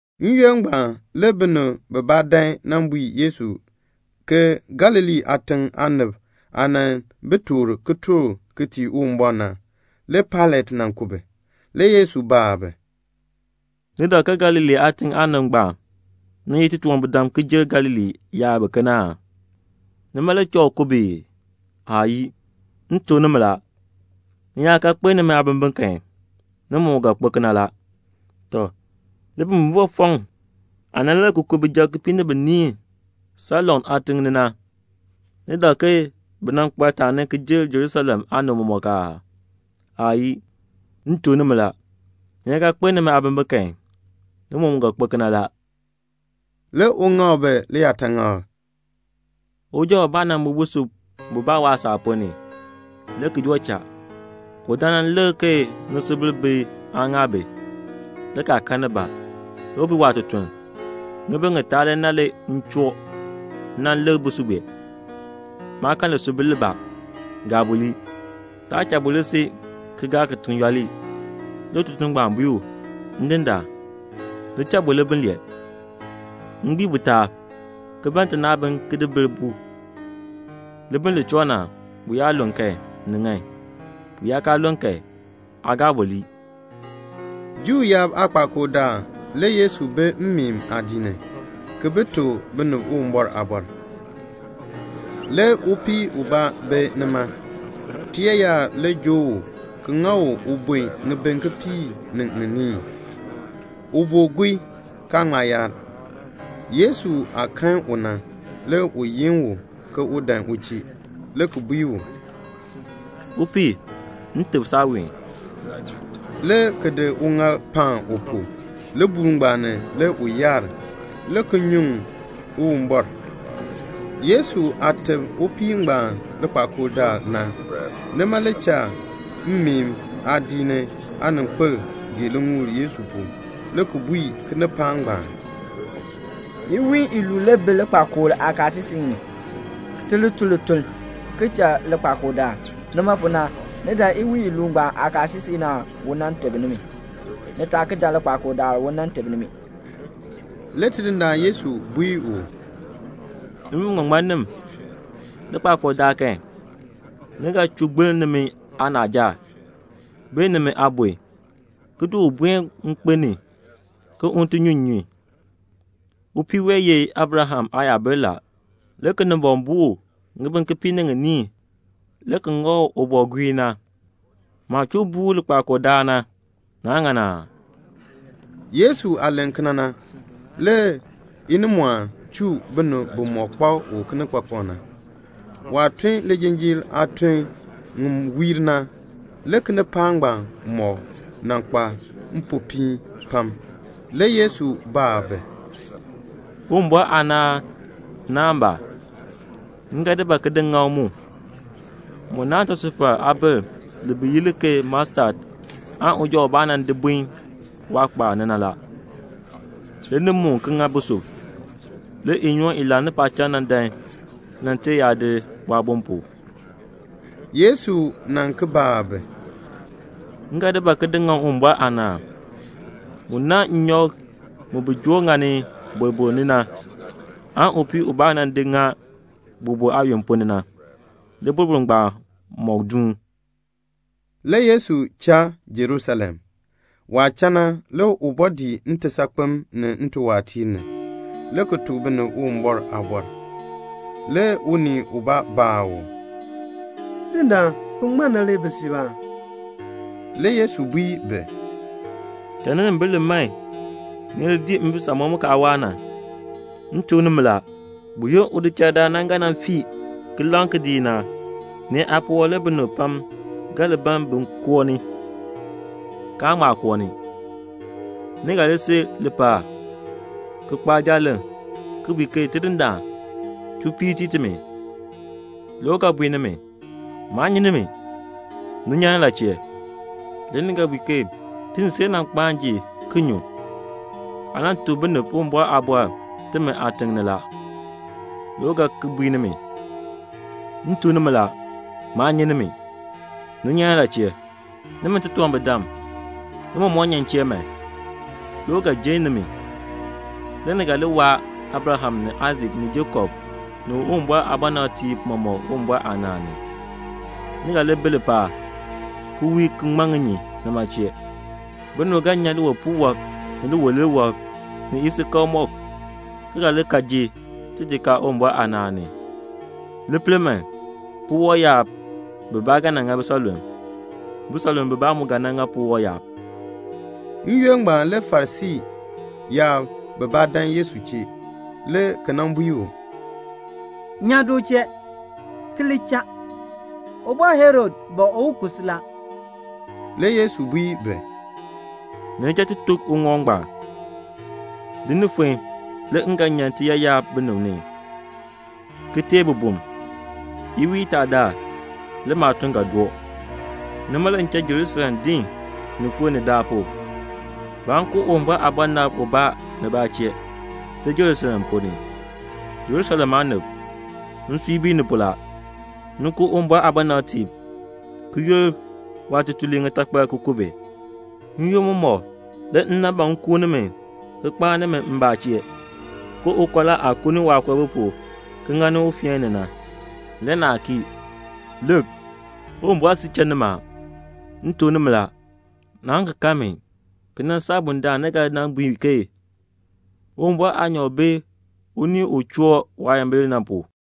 N-yoonn ngbaan le binib bibaa dan nan bui Yesu ke Galilee aatiŋ aanib aah nan bi toor kitork ki tii Uwumbɔr na, le Pailat nan ku bi. Le Yesu baa bi, "Ni dak ke Galilee aatiŋ aanib ngbaan nan ye titunwambirdam ki jer Galilee yaab biken aa? Nima le cha u ku bi ii? Aayii. M tuk nimi la, ni yaa kaa kpeln nimi aabimbin kan, ni mɔmɔk ga kpo kena la. Tɔ, libimbifɔfɔkn aah nan lir ki ku bijab kipiik ni biniin Siloam ni na, ni dak ke bi nan kpa taani ki jer Jerusalem aanib mɔmɔk aa? Aayii. M tuk nimi la, ni yaa kaa kpeln nimi aabimbin kan, ni mɔmɔk ga kpo kena la." Le u ŋak bi liyaataŋakl, "Uja ubaa nan bun busub bubaa waasaak ponn ni; le ki joo cha, le u dan nan lik ke ŋisubil bi aa ŋaa bi, le kaa kan nibaa. Le u bui waatutuln, 'Ŋibin ŋitaa le na m dan nan lik busub bue. Maa kan lisubil libaa. Gaa bu lii. Taa cha bu li si ki gaa kitiŋ yooli.' Le ututuln ngbaan bui u, 'Ndindaan, cha bu libiln lee, m gbii bu taab, ki ban tinaabin ki bil bu. Libiln li choo na, bu yaa lun kan, ni ŋan. Bu yaa kaa lun kan, aa gaa bu lii."' Juu yaab aakpakool daal le Yesu bi mmeen aadiik ni, ki tuk binib Uwumbɔr aaliin. Le upii ubaa bi nima. Tiyaayar le joo u ki ŋa u ubun ŋibin kipiik ni ŋiniin. U boo guii, kaa ŋma yaar. Yesu aah kan u na, le u yin u ke un dan u chee, le ki bui u, "Upii, m teb saaween," le ki di uŋaal paan u pu. Libuul ngbaan ni le u yaar, le ki nyuŋ Uwumbɔr. Yesu aah teb upii ngbaan likpakool daal na, nima le cha mmeen aadiik ni aaninkpil gee liŋuul Yesu pu, le ki bui kinipaak ngbaan, "Iwiin iluub le bi likpakool aakaasisik ni, ti li tun lituln, ki cha likpakool daal. Nima pu na, ni dan iwiin iluub ngbaan aakaasisik ni aan u teb nimi. Ni taa ki dan likpakool daal u nan teb nimi." Le Tidindaan Yesu bui u, "Nimi biŋmaŋmannim, likpakool daal kan, ni ga chuu gbiln nimi aanaaja, bee nimi aabon, ki di u buen nkpen ni ke un ti nyu nnyun. Upii wee, u ye Abraham aayabil na, le Kinimbɔŋ buu u ŋibin kipiik ni ŋiniin le ki ŋa u u boo guii na. Maah chuu buur u likpakool daal na, naa ŋan aa?" Yesu aah len kena na, le binib bimɔk kpak u kinikpakpak na, inimɔɔn chuu bi. Waah tun lijinjiir aatun ŋi wiir na, le kinipaak ngbaan mɔk nan kpa mpopiin pam. Le Yesu baa bi, "Uwumbɔr aanaan naahn ba? M ga di ba ki di ŋaŋ mu? Mu naahn tisufar aabil, bi yi li ke mustad, li uja ubaa nan di bun waakpaab ni na. Le li muun ki ŋa busub. Le inyoon i laani paacham na dan nan ter yaadir bu aabon pu." Le Yesu ki baa bi, "M ga di ba ki di ŋaŋ Uwumbɔr aanaan? Mu naahn nnyɔk bi joo ŋani boroboro na, upii nan di ŋa boroboro aayon ponn ni, boroboro ngbaan mɔk duun la." Le Yesu cha Jerusalem. Waah cha na, le u bɔɔ dii ntisaakpem ni ntiwaatiir ni, le ki tuk binib Uwumbɔr aaliin. Le unii ubaa baa u, "Ndindaan, bin ŋmar na le bi siib aa?" Le Yesu bui bi, "Cha ninimbil li man ni li dii mbisamɔb mu kaa waa na. M tuk nimi la, buyoonn udichaldaan na ga nan fii ki laŋ kidiik na, nee aapuwɔb le binib pam ga li ban bin koo ni, kaan ŋma koo ni. Le ni ga si lipaal, le ki kpaa jaaleŋ, ki bui ke 'Tidindaan, chuu piir tii timi.' Le u ga bui nimi, 'Maa nyi nimi. Ni nyan ni la chee?' Le ni ga bui ke 'Ti ni si le nan kpaan ji ki nyun. Aa nan tuk binib Uwumbɔr aaliin timi aatiŋ ni la.' Le u ga ki bui nimi, 'M tuk nimi la, maa nyi nimi. Ni nyan ni la chee? Nimi titunwambirdam, ni mɔmɔk nyan m chee man.' Le u ga jenn nimi. Le ni ga li waa Abraham ni Aisak ni Jakob ni Uwumbɔr aabɔnabtiib mɔmɔk Uwumbɔr aanaan ni. Ni ga li bi lipaal, ki wii ki ŋman ŋinyin nima chee. Binib ga nyan liwipuul wɔb, ni liwilir wɔb, ni isikakl mɔk, ki ga li kal ki ji tijikaar Uwumbɔr aanaan ni. Li pel man, puwɔb yaab bibaa ga nan ŋa bisanlulm. Bisanlulm bibaa mu ga nan ŋa puwɔb yaab." N-yoonn ngbaan le Farisii yaab bibaa dan Yesu chee, le ki nan bui u, "Nyan du chee, ki li cha. Ubɔr Herod ban un ku si la." Le Yesu bui bi, "Ni li cha ti tuk uŋɔk ngbaan, 'Din ni fon le m ga nyan tiyaayar binib ni, ki teei bibum. Iwiin itaa daal le maatuln ga doo.' Nima le m cha Jerusalem din ni fon ni daalpu. Baan ku Uwumbɔr aabɔnabr ubaa nibaa chee, see Jerusalem ponn ni. "Jerusalem aanib, nsui bii ni pu la. Ni ku Uwumbɔr aabɔnabtiib, ki yur waatutuliib ŋitakpal ki ku bi. N-yoonn mɔmɔk le m nan ban m kuun nimi ki kpaan nimi m chee, ke ukɔla aah kuuni waakoobi pu ki ŋani ufeen ni na, le naa kii. Lik, Uwumbɔr siir cha nimi. M tuk nimi la, naan ki kan mi ki nan saa bundaln ni ga bui ke, 'Tidindaan Uwumbɔr aanyoor bi un choo waayimbil ni na pu."'